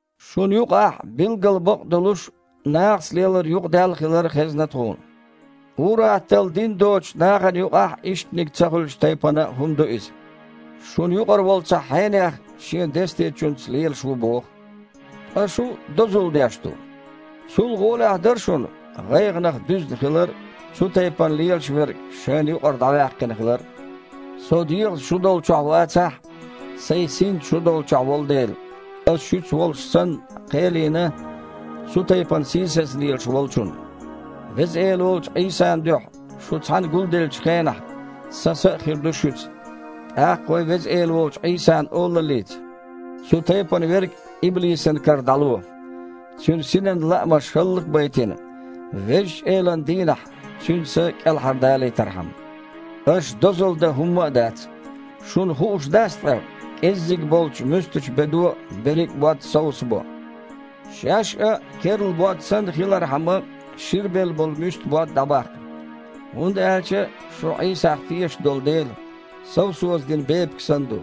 Шуна юкъахь, билггал бакъ а долуш, нахаца лелар юкъадаьлла хилар хезна тхуна. Ур-атталла дин доцучу нахана юкъахь а иштаниг ца хуьлучу тайпана хІума ду иза. Шуна юкъара волу цхьа хьенех шен дестечуьнца лелаш ву боху. Ткъа шу дозалла деш ду! Цул а гІолехь дара шуна, гІайгІанах дуьзна хилар а, цу тайпана лелаш верг шайна юкъара дІаваьккхина хилар а. Со дегІаца шу долчохь вацахь а, сайн синца шу долчохь волу дела, аса шуьца волуш санна кхел йина цу тайпана сийсаза лелаш волчунна. Веза Эла волчу Іийсан дуьхьа шу цхьаьна гулделлачу хенахь, сан са а хир ду шуьца, тІаккха вайн Веза Эла волчу Іийсан олаллица цу тайпана верг иблисан кара дІало, цуьнан синан лаамаш хІаллак а байтина, Везачу Элан дийнахь цуьнан са кІелхьардалийтархьама. Аша дозалла дан хІумма а дац. Шуна хууш дац ткъа: «КІеззиг болчу муьстачу бедо берриг а бод совсабо»? Шаьш а керла бод санна хилархьама, ширбелла болу муьста бод дІабаккха. ХІунда аьлча шу Іийсах тешаш долу дела, совсоза дина бепиг санна ду.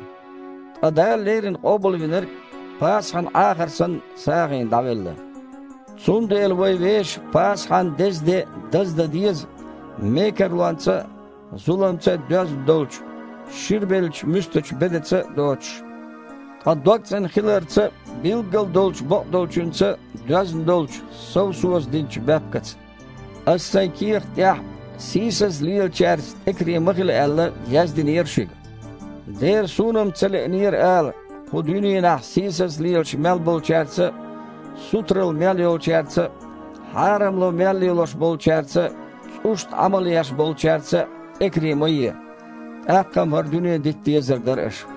Ткъа Дала леррина Къобалвинарг Пасахьан Іахар санна сагІина дІавелла. Цундела вай вешан Пасахьан дезде даздан деза мекарлонца а, зуламца а доьзна долчу, ширбеллачу муьстачу бедаца а доцуш, ткъа догцІена хиларца а, билггал долчу бакъдолчуьнца а доьзна долчу совсоза динчу баьпкаца. Аса сайн кехата тІехь, сийсаза лелачаьрца тІекаре ма хила аьлла, яздинера шуьга. Дера суна-м ца лиънера ала, кху дуьненахь сийсаза лелаш мел болчаьрца а, сутаралла мел йолчаьрца а, хьарамло мел лелош болчаьрца а, цІушна Іамал еш болчаьрца а тІекаре ма е. ТІаккха-м хІара дуьне дита дезар дара аша.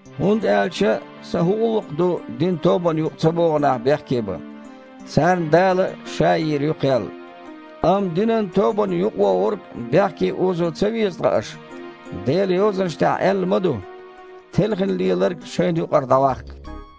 ХІунда аьлча сан хІун гІуллакх ду динан тобанан юкъа ца богІу нах бехке бан? Царна Дала Ша йийр ю кхел. Амма динан тобанна юкъавогІург бехке озо ца веза ткъа аша? Делан Йозанаш тІехь аьлла ма ду: «Телхина леларг шайна юкъара дІаваккха».